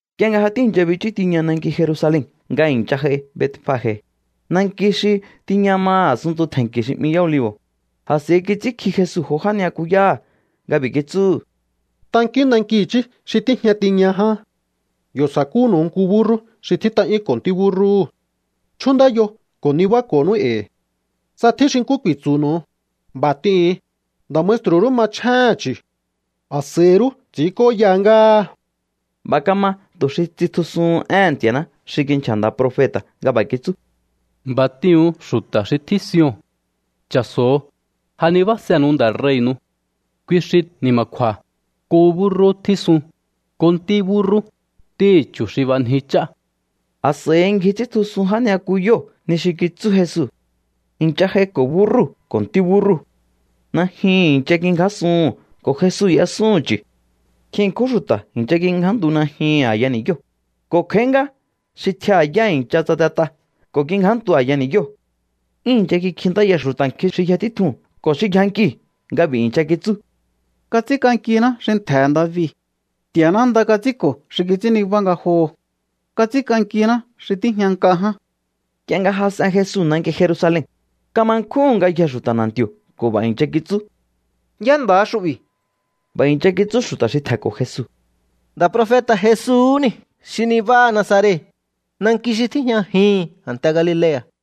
Nk'ie nga ja tíi̱ncha bichú tiña nanki Jerusalen nga i̱ncha j'ai Betfage, nanki xi tiña maha̱ a̱sunntu tje̱nki̱ xi 'mi Yá Olivo̱, a̱s'a̱i kits'ínkji Jesu jo já ni'yakuyáha̱ nga b'i̱ kitsúhu̱: —Tankíún nanki i̱chí xi tíjña tiña ján. Yo̱ sa̱kúnu̱u nku búrrú xi tjít'a'yúnko̱ ntí búrrúhu̱. Chjúndáyo ko̱ nibáko̱nú e̱i̱. Tsa tjín xi nkú ku̱i̱tsu̱nu̱u, b'a̱ t'ihu̱un: “Nda̱ maestru̱ rú machjéhe̱n chu̱. A̱s'a̱i rú ts'i̱ínk'óya ngáha.” B'a̱ kama tu̱ xi tsitjusuhun éhe̱n Nti̱a̱ná xi kinchja̱ nda̱ profeta̱ nga b'a̱ kitsú: B'a̱ t'ihu̱un xu̱ta̱ xi tjín Sion: “Cha̱so̱o, ja nibásenu̱u Nda̱ rei̱nu̱u. Kui xi ni̱ma̱kju̱a̱, nku búrrú tjísun, nku ntí búrrú, ntíhi̱ chu̱ xi b'anji ch'á.” A̱s'a̱i ngji ts'íntjusun já ni'yakuyóo̱ ni xi kitsú Jesu. I̱ncha j'aiko̱ búrrúu̱ ko̱ ntí búrrúu̱. Najyuhu̱n i̱ncha kingjásuhu̱n ko̱ Jesu y'esúhu̱n chu̱. Nkjin ṉkjún xu̱ta̱ i̱ncha kingjántu najyuhu̱n a̱ya ni̱yóo̱, ko̱ kj'a̱í ngá xi tjiaha̱ yá i̱ncha tsatet'a ko̱ kingjántu a̱ya ni̱yóo̱. 'Yún i̱ncha kikjintáya xu̱ta̱ nkjin xi yja títjuu̱n ko̱ xi yjankiu̱ nga b'i̱ i̱ncha kitsú: —¡Kats'ínk'ankiná xi ntje̱he̱ David! ¡Nti̱a̱ná nda kats'ínko̱ xi kits'ín nibá ngajoho̱! ¡Kats'ínk'ankiná xi tíjña nk'a ján! Nk'ie nga jas'en Jesu nanki Jerusalen, kama nkjúhu̱n ngayjee̱ xu̱ta̱ na̱nti̱o̱ ko̱ b'a̱ i̱ncha kitsú: —¿Yá nda̱ha xu'bi̱? B'a̱ i̱ncha kitsú xu̱ta̱ xi tje̱nko̱ Jesu: —Nda̱ profeta̱ Jesuu̱hú niu̱ xi nibáha Nazaret, nanki xi tíjñajihi̱n a̱nte Galilea̱.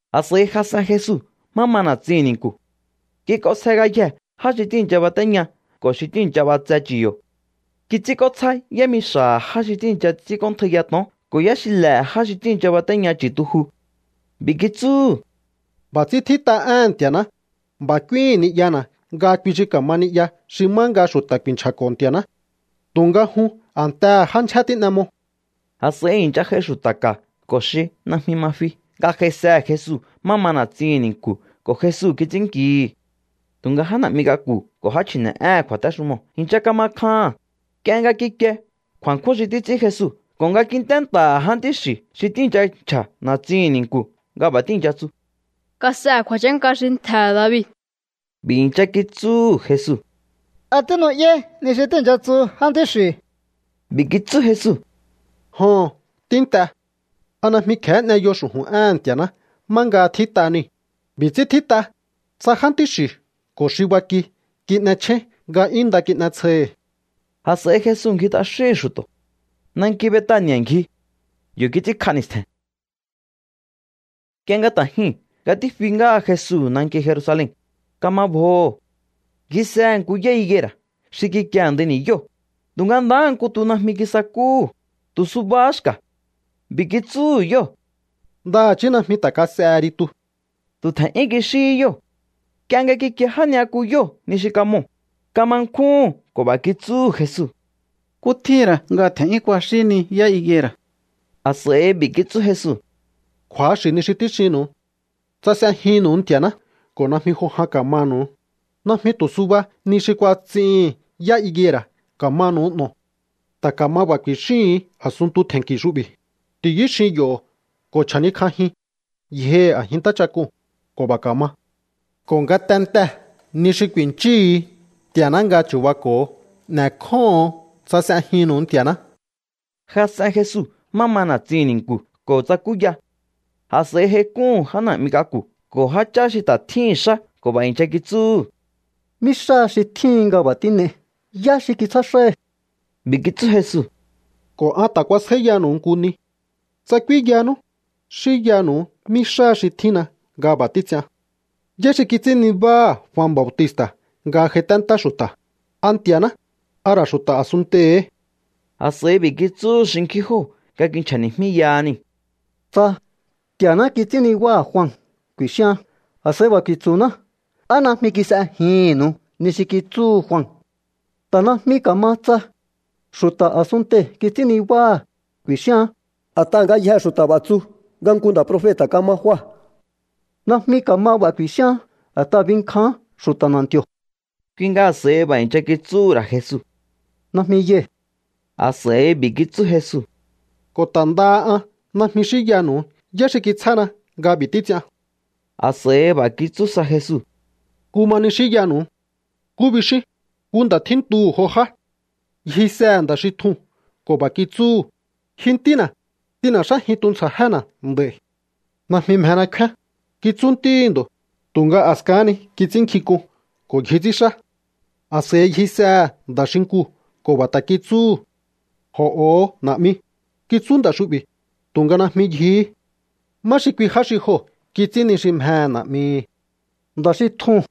A̱s'a̱i jas'en Jesu má ma na̱tsihi̱n ni̱nku̱. Kik'onsje ngayjee̱ já xi tíi̱ncha batéña ko̱ xi tíi̱ncha b'atse chu̱ yo̱. Kits'ínk'ótsjá yámixa̱ha̱ já xi tíi̱ncha ts'ínk'óntjaiya to̱on ko̱ yáxile̱he̱ já xi tíi̱ncha batéña chu̱tuju. B'i̱ kitsúhu̱: —B'a̱ ts'ín tjít'a éhe̱n Nti̱a̱ná: “B'a̱ k'úíhi̱n ni'yana̱ nga kui xi ka̱ma ni'ya xi má nga xu̱ta̱ ku̱i̱nchja̱ko̱ Nti̱a̱ná.” Tu̱nga jun a̱ntehe̱ já ndyjé tín'e mo. A̱s'a̱i i̱ncha j'ai xu̱ta̱ ka̱ ko̱ xi najmi ma fi nga j'aisehe̱ Jesu má ma na̱tsihi̱n ni̱nku̱ ko̱ Jesu kits'ínnkihi̱. Tu̱nga já na̱'mi k'aku̱ ko̱ já chji̱ne̱'éhe̱n kju̱a̱téxumoo̱ i̱ncha kama kjaha̱n, nk'ie nga kikie kju̱a̱nkjún xi títs'ín Jesu ko̱ nga kint'é nta̱ha̱ jántí xi̱ xi tíi̱ncha nchja̱ na̱tsihi̱n ni̱nku̱ nga b'a̱ tíi̱ncha tsu: “¡Kas'ehe̱ kju̱a̱chánka xi ntje̱he̱ David!” B'a̱ i̱ncha kitsúhu̱ Jesu: —¿A tínu'yáí ni xi tíi̱ncha tsu jántí xi̱u̱? B'i̱ kitsú Jesu: —Joho̱n, tínt'e. ¿A najmi kje̱hé n'eyo xu̱ju̱n éhe̱n Nti̱a̱ná má nga tjít'a niu̱? B'i̱ ts'ín tjít'a: Ts'a jántí xi̱u̱ ko̱ xi baki kin'echjéín nga 'yún nda kin'etsjohi. A̱s'a̱i Jesu ngji t'axíhi̱n xu̱to̱. Nanki Betani̱a̱ ngji. Yo̱ kits'ínkj'a ni̱stje̱n. Nk'ie nga ta̱ jyuu̱n nga tífi ngáha Jesu nanki Jerusalen, kama bjoho̱. Ngjisehe̱ nku yá higuera̱ xi kikie a̱ndai ni̱yóo̱, tu̱nga ndahá nku tu najmi kisakúhu̱, tu̱ subahá xka̱. B'i̱ kitsúhu̱ yóo̱: —Ndaha̱chí najmi ta̱ kas'ehe ri tu. Tu̱ tje̱n'yún kixíhí yóo̱. Nk'ie nga kikie já ni'yakuyóo̱ ni xi kamoo̱, kama nkjúhu̱n ko̱ b'a̱ kitsúhu̱ Jesu: —¿Nkú tjíhi̱n ra̱ nga tje̱n'yún kuaxíhí ni yá higuera̱? A̱s'a̱i b'i̱ kitsú Jesu: —Kju̱axi̱ ni xi tíxinnu̱u. Tsa s'ejinnu̱u Nti̱a̱ná ko̱ najmi jo jan ka̱manu̱u, najmi tu̱ suba ni xi kuats'ihi̱n yá higuera̱ ka̱manu̱u n'o̱o. Ta̱ ka̱ma b'a̱ ku̱i̱xíhu̱un a̱sunntu tje̱nki̱ xu'bi̱: “Ti̱yú xin yo̱ ko̱ chja̱níkj'ajin yjohi̱ a̱jin ntáchak'uu̱n”, ko̱ b'a̱ ka̱ma. Ko̱ ngatentee̱ ni xi ku̱i̱nchíhu̱u Nti̱a̱ná nga chu̱bako̱o, n'e̱kjóho̱on tsa s'ejinnu̱u Nti̱a̱ná. Jas'en Jesu má ma na̱tsihi̱n ni̱nku̱ ko̱ tsakúya. A̱s'a̱i j'aik'úhu̱n já na̱'mi k'aku̱ ko̱ jáchá xi ta̱ tjíhi̱n xá ko̱ b'a̱ i̱ncha kitsúhu̱: —¿Mí xá xi tjíhin nga b'a̱ tín'ei? ¿Yá xi kitsjá xáhi? B'i̱ kitsú Jesu: —Ko̱ an ta̱ kuasjáíyanu̱u nku ni. Tsa k'úínyanú, xínyanu̱u mí xáha xi tjínna nga b'a̱ títs'ian. ¿Yá xi kits'ín nibáha̱ Jua Bautista̱ nga j'aiténtá xu̱ta̱? ¿A Nti̱a̱ná, a ra̱ xu̱ta̱ a̱sunntei̱hí? A̱s'a̱i b'i̱ kitsúhu̱ xinkjín jóo̱ nga kinchja̱ni̱jmíyaha niu̱: —Tsa: “Nti̱a̱ná kits'ín nibáha̱ Jua”, ku̱i̱xíaán, a̱s'a̱i b'a̱ ku̱i̱tsu̱ná: “¿Á najmi kis'ejihi̱nnu̱u ni xi kitsúhu Jua?” Ta̱ najmi ka̱ma tsa: “Xu̱ta̱ a̱sunntei̱ kits'ín nibáha̱”, ku̱i̱xíaán, a̱t'aha̱ ngayjee̱ xu̱ta̱ b'a̱ tsu nga nku nda̱ profeta̱ kama Jua. Najmi ka̱ma b'a̱ ku̱i̱xíaán a̱t'aha̱ binkjaán xu̱ta̱ na̱nti̱o̱. Kui nga a̱s'a̱i b'a̱ i̱ncha kitsúhu̱ ra̱ Jesu: —Najmi yai̱. A̱s'a̱i b'i̱ kitsú Jesu: —Ko̱ ta̱ ndaha an najmi xínyanu̱u yá xi kitsjána nga b'i̱ títs'ian. A̱s'a̱i b'a̱ kitsú sa Jesu: —Nkú ma ni xínyanu̱u. ¿Nkú bixíún? Nku nda̱ tjíntuhu̱ jo já. Ngjisehe̱ nda̱ xi tjuu̱n ko̱ b'a̱ kitsúhu̱: “Ji ntína̱, t'in n'e̱xájin tuntsja̱jéna̱ nd'a̱i̱.” “Najmi mjena kfíán”, kitsú ntíhi̱ ndo̱, tu̱nga a̱skahán ni kits'ínnkjink'un ko̱ ngji ts'ínxá. A̱s'a̱i ngjisehe̱ nda̱ xinkuu̱ ko̱ b'a̱ ta̱ kitsúhu̱. “Jo̱'o̱ho, na̱'mi”, kitsú nda̱ xu'bi̱, tu̱nga najmi ngjihí. ¿Má xi kui já xi joo̱ kits'ín ni xi mjehe̱ na̱'mihi̱? —Nda̱ xi tjuu̱n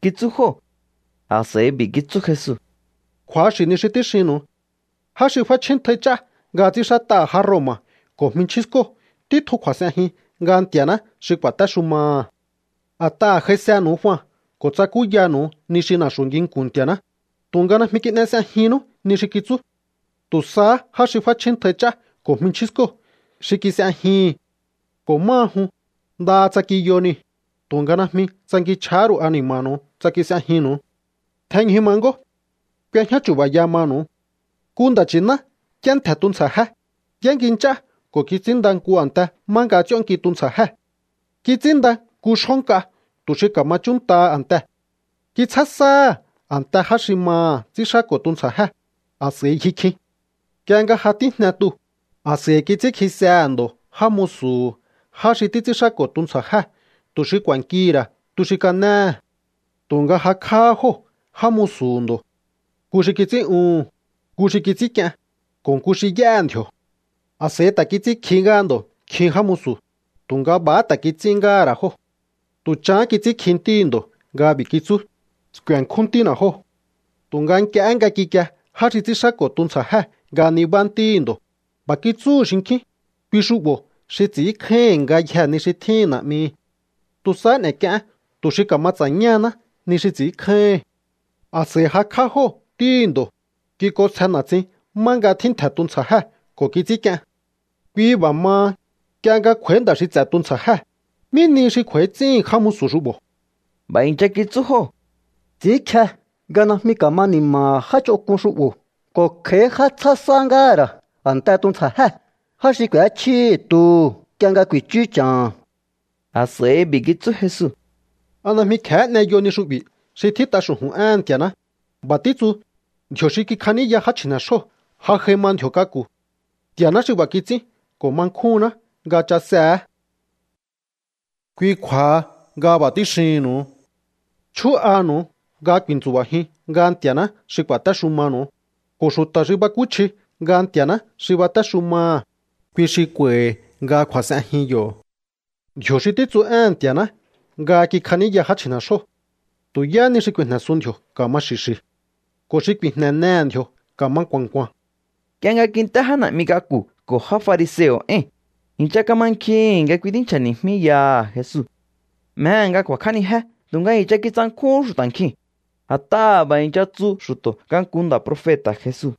—kitsú jóo̱. A̱s'a̱i b'i̱ kitsú Jesu: —Kju̱axi̱ ni xi tíxinnu̱u. Já xi f'áchjíntjai ch'á nga ts'ínxát'aha̱ já Roma̱ ko̱ jminchjín skóo̱ títjun kju̱a̱s'enjin nga Nti̱a̱ná xi ku̱a̱téxumaha̱. A̱t'aha̱ j'aisenu̱u Jua ko̱ tsakúyanu̱u ni xi na̱xu̱ nginku̱n Nti̱a̱ná, tu̱nga najmi kin'e s'ejinnú ni xi kitsú. Tu̱ sahá já xi f'áchjíntjai ch'á ko̱ jminchjín skóo̱ xi kis'ejihi̱n. Ko̱ máha jun, ndaha tsa kiyo niu̱, tu̱nga najmi tsankinchj'ahá ru̱u ani̱ma̱nu̱u tsa kis'ejinnu̱u. ’Tjenñju ma ngó. K'u̱e̱jñá chu̱ba̱ya manu̱u. Nku nda̱ nchi̱ná y'éntje̱ tuntsja̱jé, y'éngi nch'á ko̱ kits'ínnda nku a̱nte má nga ts'íónnki tuntsja̱jée̱. Kits'ínnda nku xjó nk'a tu̱ xi ka̱ma chúnntaha a̱ntee̱. Kitsjá sáha̱ a̱ntee̱ já xi maha̱ ts'ínxáko̱ tuntsja̱jée̱, a̱s'a̱i ngji kjin. Nk'ie nga ja tíjne tuu̱, a̱s'a̱i kits'ínkjisehe̱ ndo̱ já musu̱hu̱ já xi títs'ínxáko̱ tuntsja̱jée̱ tu̱ xi ku̱a̱nkihi̱ ra̱ tu xi kanéhe̱. Tu̱nga jakj'áhá jóo̱ já musu̱hu̱ ndo̱. Nku xi kits'ín'uhu̱n, nku xi kits'ínk'ien, ko̱ nku xi y'éhe̱ ndji̱o̱. A̱s'a̱i ta̱ kits'ínkjihí ngáha ndo̱ nkjin já musu̱, tu̱nga b'a̱há ta̱ kits'ín ngáha̱ ra̱ jóo̱. ’Tu̱ chahán kits'ínkji ntíhi̱ ndo̱ nga b'i̱ kitsú: “Sku̱e̱nkjún ntína̱ jóo̱.” Tu̱nga nk'iehé nga kikie já xi ts'ínxáko̱ tuntsja̱jée̱ nga nibá ntíhi̱ ndo̱, b'a̱ kitsúhu̱ xinkjín: “Kui xu'bo̱ xi ts'i̱ínkjáíhi̱n ngayjee̱ ni xi tjíhi̱n na̱'mihi̱. Tu̱ sahá n'e̱k'ieén tu̱ xi ka̱ma ts'a̱ñáhaná ni xi ts'i̱ínkjáíhi̱n.” A̱s'a̱i jakj'á jóo̱ ntíhi̱ ndo̱, kik'onsje na̱tsin má nga tjíntje̱ tuntsja̱jée̱ ko̱ kits'ínk'ien. Kui b'a̱ maha, nk'ie nga kj'u̱a̱í nda̱ xi ts'e̱ tuntsja̱jée̱, ¿mí nihi xi kj'u̱a̱í ts'íhi̱n já musu̱ xu'bo̱? B'a̱ i̱ncha kitsú jóo̱: —Ts'i̱ínkje nga najmi ka̱ma ni̱ma̱ha̱ já ch'onk'un xu'bo̱ ko̱ kj'a̱í já tsjá sá ngáha̱ ra̱ a̱nte tuntsja̱jée̱, já xi k'u̱échjíhi̱ tuhu̱ nk'ie nga ku̱i̱chú cha̱ha̱n. A̱s'a̱i b'i̱ kitsú Jesu: —¿A najmi kje̱hé n'eyo ni xu'bi̱ xi tjít'a xu̱ju̱n éhe̱n Nti̱a̱ná? B'a̱ títsu: Ndji̱o̱ xi kikjaníya já chji̱ne̱xjóo̱ ja j'ai ma ndji̱o̱ k'aku̱. Nti̱a̱ná xi b'a̱ kits'ín ko̱ ma nkjúnná nga chasehe̱é. Kui kju̱a̱ha nga b'a̱ tíxihi̱nnu̱u. Chjú'anu̱u nga ku̱i̱ntsu̱ba̱jiun nga Nti̱a̱ná xi ku̱a̱téxumanu̱u, ko̱ xu̱ta̱ xi bakúchji nga Nti̱a̱ná xi batéxumaha̱, kui xi kj'u̱a̱i̱hi̱ nga kju̱a̱s'enjin yo̱. Ndji̱o̱ xi títsu éhe̱n Nti̱a̱ná nga kikjaníya já chji̱ne̱xjóo̱, tu̱ yáhá ni xi ku̱i̱jne̱sun ndji̱o̱ ka̱ma xi̱xi̱. Ko̱ xi ku̱i̱jne̱nehe̱ ndji̱o̱ ka̱ma nku̱a̱n nku̱a̱n. Nk'ie nga kint'é já na̱'mi k'aku̱ ko̱ já fariseo̱ éi̱n, i̱ncha kamankjihi̱n nga kui tínchja̱ni̱jmíyaha Jesu. Mjehe̱ nga ku̱a̱kj'ánijé tu̱nga i̱ncha kitsankjúhún xu̱ta̱ nkjiu̱n, a̱t'aha̱ b'a̱ i̱ncha tsu xu̱to̱ nga nku nda̱ profeta̱ Jesu.